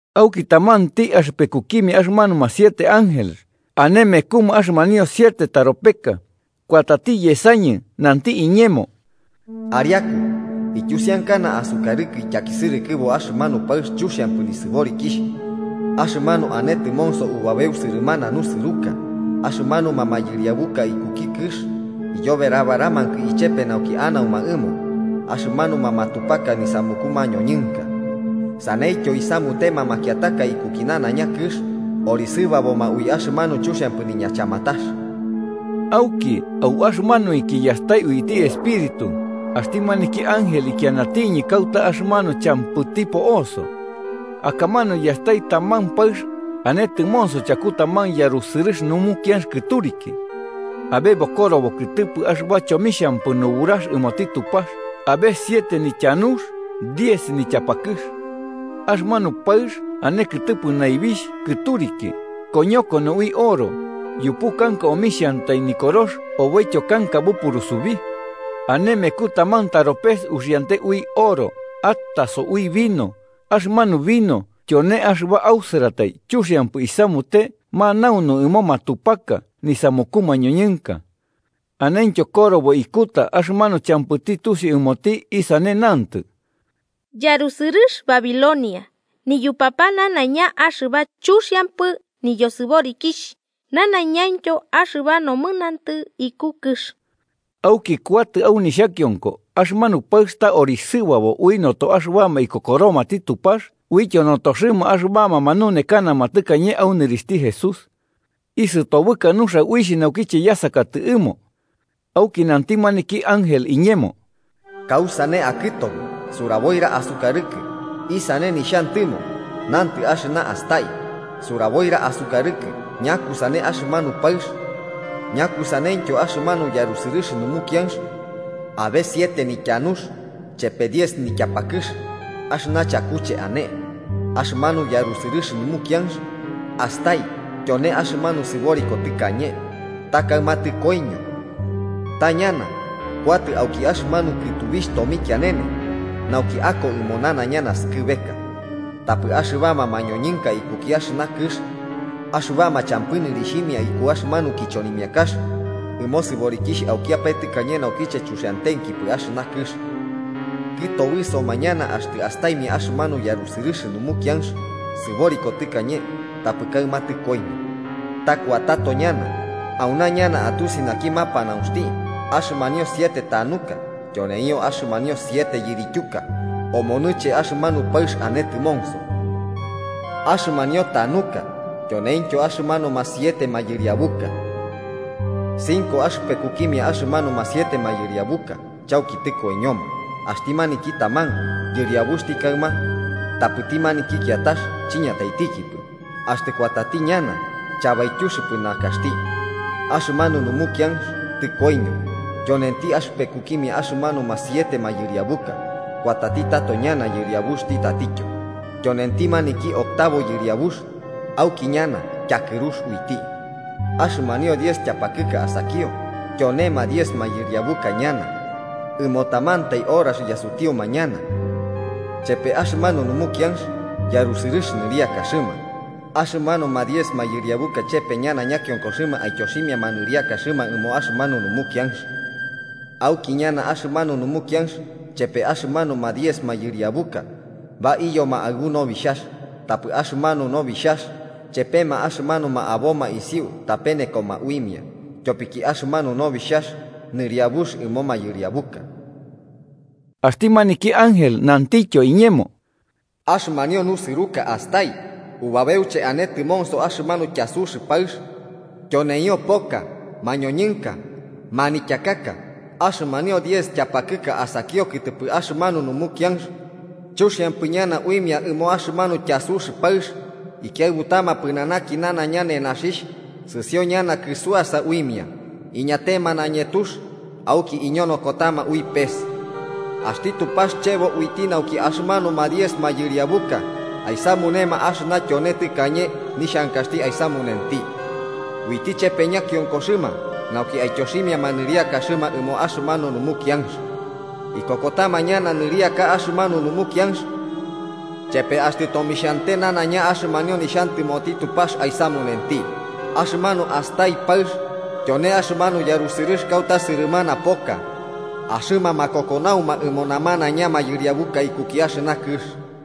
Auki tamanti axɨpekukimia axɨmanuma siete ángeles ane mekuma axɨmanio siete taropeka, kuatati yesañɨ nanti iñemo: “Ariaku, ityusiankana asukarɨkɨ ityakisɨrɨkɨbo axɨmanu paɨx chuxiampɨ nisɨborikixh axɨmanu ane tɨmonso ubabeu sɨrɨmana nusɨruka. Axɨmanuma mayɨriabuka ikuki kɨx iyoberabaramakɨ ichepe nauki anauma ɨmo axɨmanuma matupaka nisamuku mañoñɨnka, saneityo isamutema makiataka ikuki nanaiña kɨx orisɨbaboma ui axɨmanu chuxiampɨ niñachamatax.” Auki au axɨmanuinki yastai uiti Espíritu, axti maniki ángel ikianatiñɨ kauta axɨmanu champɨti po'oso. Akamanu yastai taman paɨx, ane tɨmonso chaku taman yarusɨrɨx numukianx kɨturiki. Abe bokorobo kɨtɨpɨ axɨba chomixhampɨ nuburax ɨmoti Tupax abe siete nityanux diez nityapakɨx. Axɨmanu paɨx ane kɨtɨpɨ naibixh kɨturiki, koñokono ui oro, yupu kanka omixhantai nikorox oboityo kanka bupurusubi. Ane meku taman taropes uxiante ui oro ataso ui vino axɨmanu vino tyone axɨba ausɨratai chuxiampɨ isamute manaunu ɨmo matupaka nisamuku mañoñɨnka. Anentyo korobo ikuta axɨmanu champɨti tusiu ɨmoti isane nantɨ: “Yarusɨrɨx Babilonia, niyupapa nanaiña axɨba chuxiampɨ niyosɨborikixh nanaiñaintyo axɨba nomɨnantɨ iku kɨx.” Auki kuatɨ au nixhakionko axɨmanu paɨx ta orisɨbabo ui noto axɨbama ikokoromati Tupax uityo notoxɨma axɨbama manunekanama tɨkañe au nɨrixhti Jesús. Isɨtobɨka nuxia uixh, naukiche yasakatɨ ɨmo. Auki nanti maniki ángel iñemo: “¿Kausane akɨtobɨ? Suraboira asukarɨkɨ isane nixhantɨmo nantɨ axɨna astai. Suraboira asukarɨkɨ ñakusane axɨmanu paɨx, ñakusaneityo axɨmanu yarusɨrɨx numukianx abe siete nityanux chepe diez nityapakɨx axɨna chakuche ane. Axɨmanu yarusɨrɨx numukianx astai tyone axɨmanu sɨboriko tɨkañe, ta kaɨma tɨkoiño. Ta ñana, kuatɨ auki axɨmanu kɨtubixh tomikianene nauki ako ɨmo nanaiña naskɨbeka. Tapɨ axɨbama mañoñɨnka ikuki axɨna kɨx axɨbama champɨ nɨrixhimia iku axɨmanu kichonimiakax ɨmo sɨborikixh aukiapae tɨkañe naukiche chuxiantenkipɨ axɨna kɨx, kɨtobɨsoma ñana axtɨ astaimia axɨmanu yarusɨrɨx numukianx sɨboriko tɨkañe tapɨ kaɨma tɨkoiño, ta kuatato ñana. “Auna ñana atusiti naki mapanaunxti: Axɨmanio siete tanuka tyoneio axɨmanio siete yirityuka omonɨche axɨmanu paɨx ane tɨmonso. Axɨmanio tanuka, tyoneintyo axɨmanuma siete mayɨriabuka. Cinco axɨpekukimia axɨmanuma siete mayɨriabuka chauki tɨkoiñoma, axti maniki taman yɨriabuxti kaɨma tapɨti maniki kiatax chiñataitikipɨ. Axtɨ kuatati ñana, chabaityuxɨpɨ nakaxti. Axɨmanu numukianx tɨkoiño, tyonenti axɨpekukimia axɨmanuma siete mayɨriabuka. Kuatati tato ñana yɨriabuxti tatityo, tyonenti maniki octavo yɨriabux. Auki ñana tyakɨrux uiti. “Axɨmanio diez tyapakɨka asakio tyonema diez mayɨriabuka ñana. Ɨmo tamantai horax yasutiuma ñana, chepe axɨmanu numukianx yarusɨrɨx nɨriakaxɨma. Axɨmanuma diez mayɨriabuka chepe ñana ñakionkoxɨma aityoximiama nɨriakaxɨma ɨmo axɨmanu numukianx. Auki ñana axɨmanu numukianx chepe axɨmanuma diez mayɨriabuka baiyoma aɨbu Nobixhax, tapɨ axɨmanu Nobixhax chepema axɨmanuma aboma isiu tapenekoma uimia. Tyopiki axɨmanu Nobixhax Nɨriabux ɨmo mayɨriabuka.” Axti maniki ángel nantityo iñemo: “Axɨmanio nusɨruka astai, ubabeuche ane tɨmonso axɨmanu tyasux paɨx, tyoneio poka, mañoñɨnka, manityakaka. Axɨmanio diez tyapakɨka asakio kɨtɨpɨ axɨmanu numukianx chuxiampɨ ñana uimia ɨmo axɨmanu tyasux paɨx, ikiaɨbutama pɨnanaki nanaiña nenaxixh, sɨsio ñana kɨsuasa uimia, iñatema nañetux, auki iñonokotama ui pes. Axti Tupax chebo uiti nauki axɨmanuma diez mayɨriabuka aisamunema axɨna tyone tɨkañe nixhankaxti aisamunenti. Uiti chepe ñakionkoxɨma nauki aityoximiama nɨriakaxɨma ɨmo axɨmanu numukianx. Ikokotama ñana nɨriaka axɨmanu numukianx chepe axtɨ tomixhante nanaiña axɨmanio nixhantɨmoti Tupax aisamunenti. Axɨmanu astai paɨx tyone axɨmanu yarusɨrɨx kauta sɨrɨmana poka, axɨma makokonauma ɨmo namanaiña mayɨriabuka ikuki axɨna kɨx.”